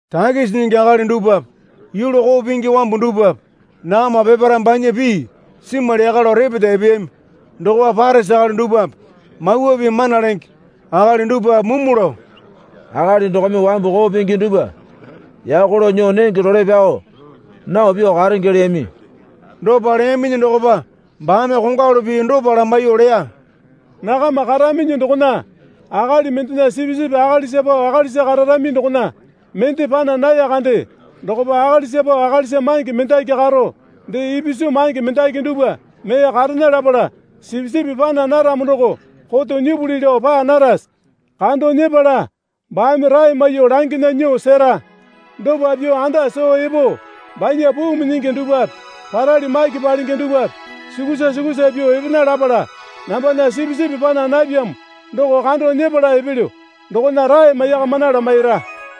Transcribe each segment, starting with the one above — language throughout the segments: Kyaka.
Takisi nyingi akali dupwape yulu koo pingi wambu dupwape nakama peparae banya pii simwali yaka lao repeta epeyami. Dokopa Parisi akali dupwape Mawa Pii mana lenge akali dupwape mumu lao, Akali dokome wambu koo pingi dupwa yako lao nyuo nenge role pyao nao pyuo karenge leyami. Dopa leyaminyi dokopa baame kongwalu pii dopa lamaiyuo leya. Nakama karaminyi dokona akali mendena sipisipi akalisa pao akalisa kararami dokona mende pana naya kande dokopa akalisa pao akalisa mange mendaki karo dee ipisu mange mendaki dupwa mee karena lapala sipisipi pana naramo doko koto nyipuli lao paa narase? Kando nyepala baame rae maiyuo langena nyuo sera. dopa pyuo anda soo epo banya puu minyingi dupwape parali maki palenge dupwape sukusa sukusa pyuo epena lapala, Nambana sipisipi pana napyamo doko kando nyepala epelyo dokona rae maiyakamana lamaira.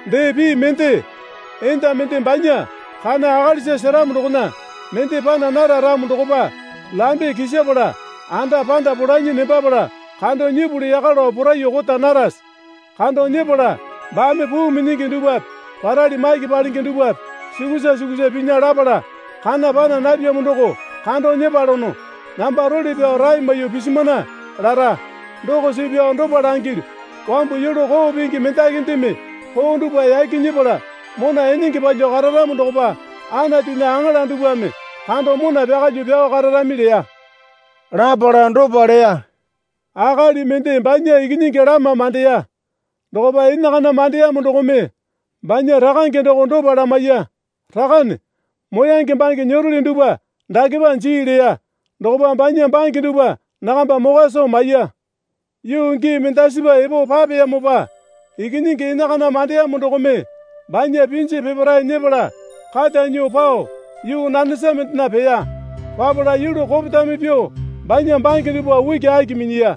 Dee pii mende, enda mende banya kana akalisa seramo dokona mende pana nara ramo dokopa lambe kisapala anda panda polanyi nembapala kando nyipuli yaka lao poraiyuo kota narase? Kando nyepala baame puu minyingi dupwape parali maki palenge dupwape sukusa sukusa pinya lapala, Kana pana napyamo doko kando nyepalono. Namba role pyao rae maiyuo pisimana, lara. Doko suu pyao dopa langilyu. Wambu yulu koo pingi mendakindeme koo dupwa yaki nyepala mona enenge palyuo kararamo dokopa Anatunya aŋala dupwame kando mona pyakalyuo pyao kararami leya. Lapala dopa leya. Akali mende banya ikinyingi lama mandeya. Dokopa enakana mandeyamo dokome banya rakange doko dopa lamaiya. Rakane, moyange bange nyeroli dupwa dakepa jii leya. Dokopa banya bange dupwa nakamba mokwa soo maiya. Yuu gii mendasipa epo papeyamopa ikinyingi enakana mandeyamo dokome banya pinji peparae nyepala kata nyuo pao yuu nanesa mendena peya. Papala yulu kopetame pyuo banya bange dupwa ukiaki minyiya.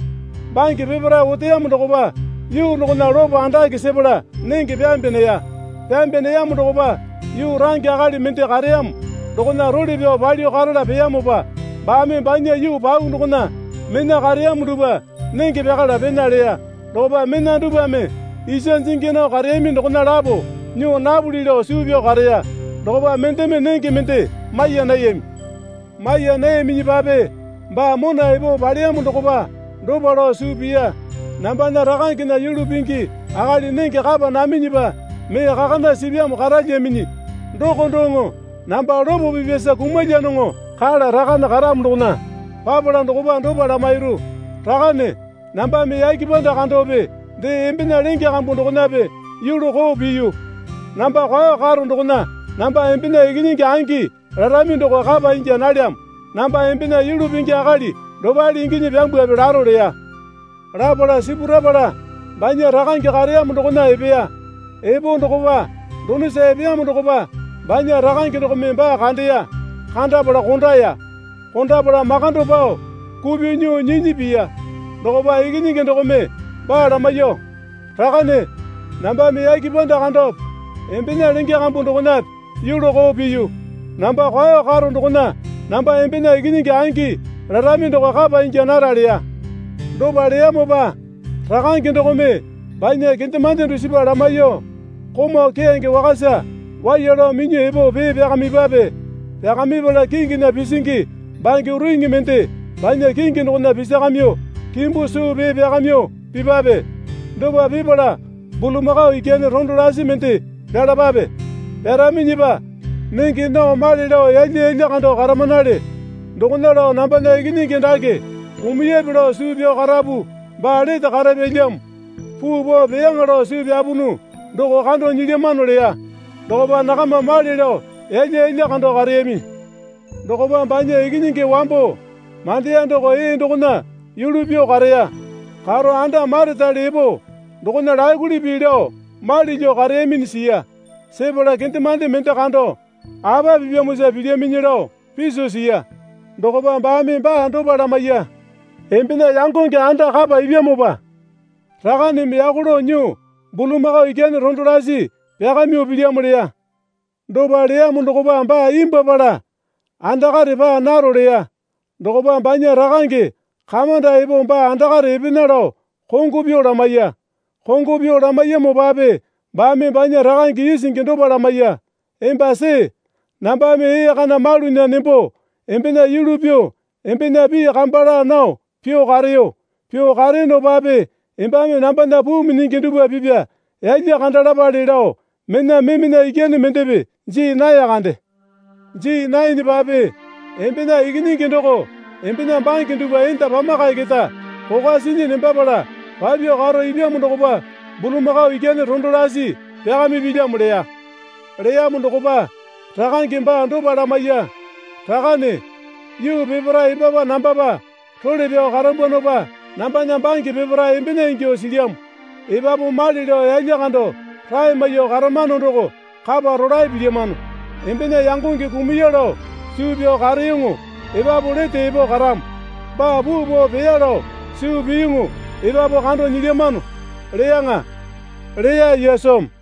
Bange peparae oteyamo dokopa yuu dokona lopo andake sepala nenge pyambe neya. Pyambe neyamo dokopa yuu range akali mende kareyamo dokona role pyao palyuo karala peyamopa baame banya yuu pau dokona mena kareyamo dupwa nenge pyakala pena leya. Dokopa mena dupwame isa jingi nao kareyami dokona lapo nyuo napuli lao suu pyao kareya. Dokopa mendeme nenge mende maiya nayami. Maiya nayaminyipape baa mona epo paleyamo dokopa dopa lao suu piya. Nambana rakangena yulu pingi akali nenge kapa naminyipa mee kakana sipyamo karalyaminyi. Doko doŋo namba lopo pipyasa kumalyanoŋo. Kala rakane karamo dokona papala dokopa dopa lamairu. Rakane nambame yake panda kandope dee embena lenge kambu dokonape yulu koo piyu. Namba kwao karo dokona namba embena ikinyingi angi larami doko kapa ingya nalyamo. Namba embena yulu pingi akali dopale inginyi pyambwape laro leya. Lapala sipurapala banya rakange kareyamo dokona epeya. Epo dokopa donosa epeyamo dokopa banya rakange dokome baa kandeya. Kandapala kondaya. Kondapala makando pao kupyuo nyuo nyinyi piya. Dokopa ikinyingi dokome baa lamaiyuo, Rakane, nambame yake panda kandope embena lenge kambu dokonape yulu koo piyu. Namba kwao karo dokona namba embena ikinyingi angi larami doko kapa inya nara leya. Dopa leyamopa rakange dokome banya kendemande dusipa lamaiyuo, Komau keyange wakasa waiya lao minyuo epo pee pyakamipwape. Pyakamipala kinginya pisingi bange uriŋi mende banya kingi dokona pisakamyuo kimbu suu pee pyakamyuo pipwape. Dopa pipala bulamakao ikyane rondo lasi mende pyalapae. Pyaraminyipa nenge nao male lao yalya yalya kando karamanale. Dokona lao nambana ikinyingi dake kumuyape lao suu pyao karapu baa lete karapyalyamo. Puu pao peyaŋa lao suu pyapunu doko kando nyilyamano leya. Dokopa nakama male lao yalya yalya kando kareyami. Dokopa banya ikinyingi wambo mandeya doko ee dokona yulu pyuo kareya. Karo anda maretale epo dokona lakuli pii lao mali lyuo kareyaminyi siya. Sepala kendemande mende kando, Apa pipyamosa pilyaminyi lao piso siya. Dokopa baame baa dopa lamaiya. Embena yangonge anda kapa ipyamopa rakaneme yako lao nyuo bulamakao ikyane rondo lasi pyakamyuo pilyamo leya. Dopa leyamo dokopa baa imbwuapala, Andakare paa naro leya. Dokopa banya rakange kamanda epo baa andakare epena lao kongo pyuo lamaiya. Kongo pyuo lamaiyamopape baame banya rakange isingi dopa lamaiya. Emba see, Nambame ee kana malunya nembo embena yulu pyuo embena pii kamba laa nao pyuo kareyo. Pyuo kareyonopape embame nambana puu minyingi dupwa pipya yalya kanda lapale lao mena memena ikyane mendepe jii nae kande. Jii naenepape embena ikinyingi doko embena bange dupwa enda pamakae keta kokwa sinyi nembapala papyuo karo ipyamo dokopa bulamakao ikyane rondo lasi pyakamipilyamo, leya. Leyamo dokopa rakange baa dopa lamaiya. Rakane, yuu peparae embapa nambapa role pyao karambwanopa nambana bange peparae embena ingyuo silyamo. Epapu male lao yalya kando rae maiyuo karamano doko kapa rolae pilyamano. Embena yangonge kumuya lao suu pyao kareyoŋo epapu lete epo karamo. Baa puu pao peya lao suu piyuŋu epapu kando nyilyamano, leyaŋa, leya Yesumi.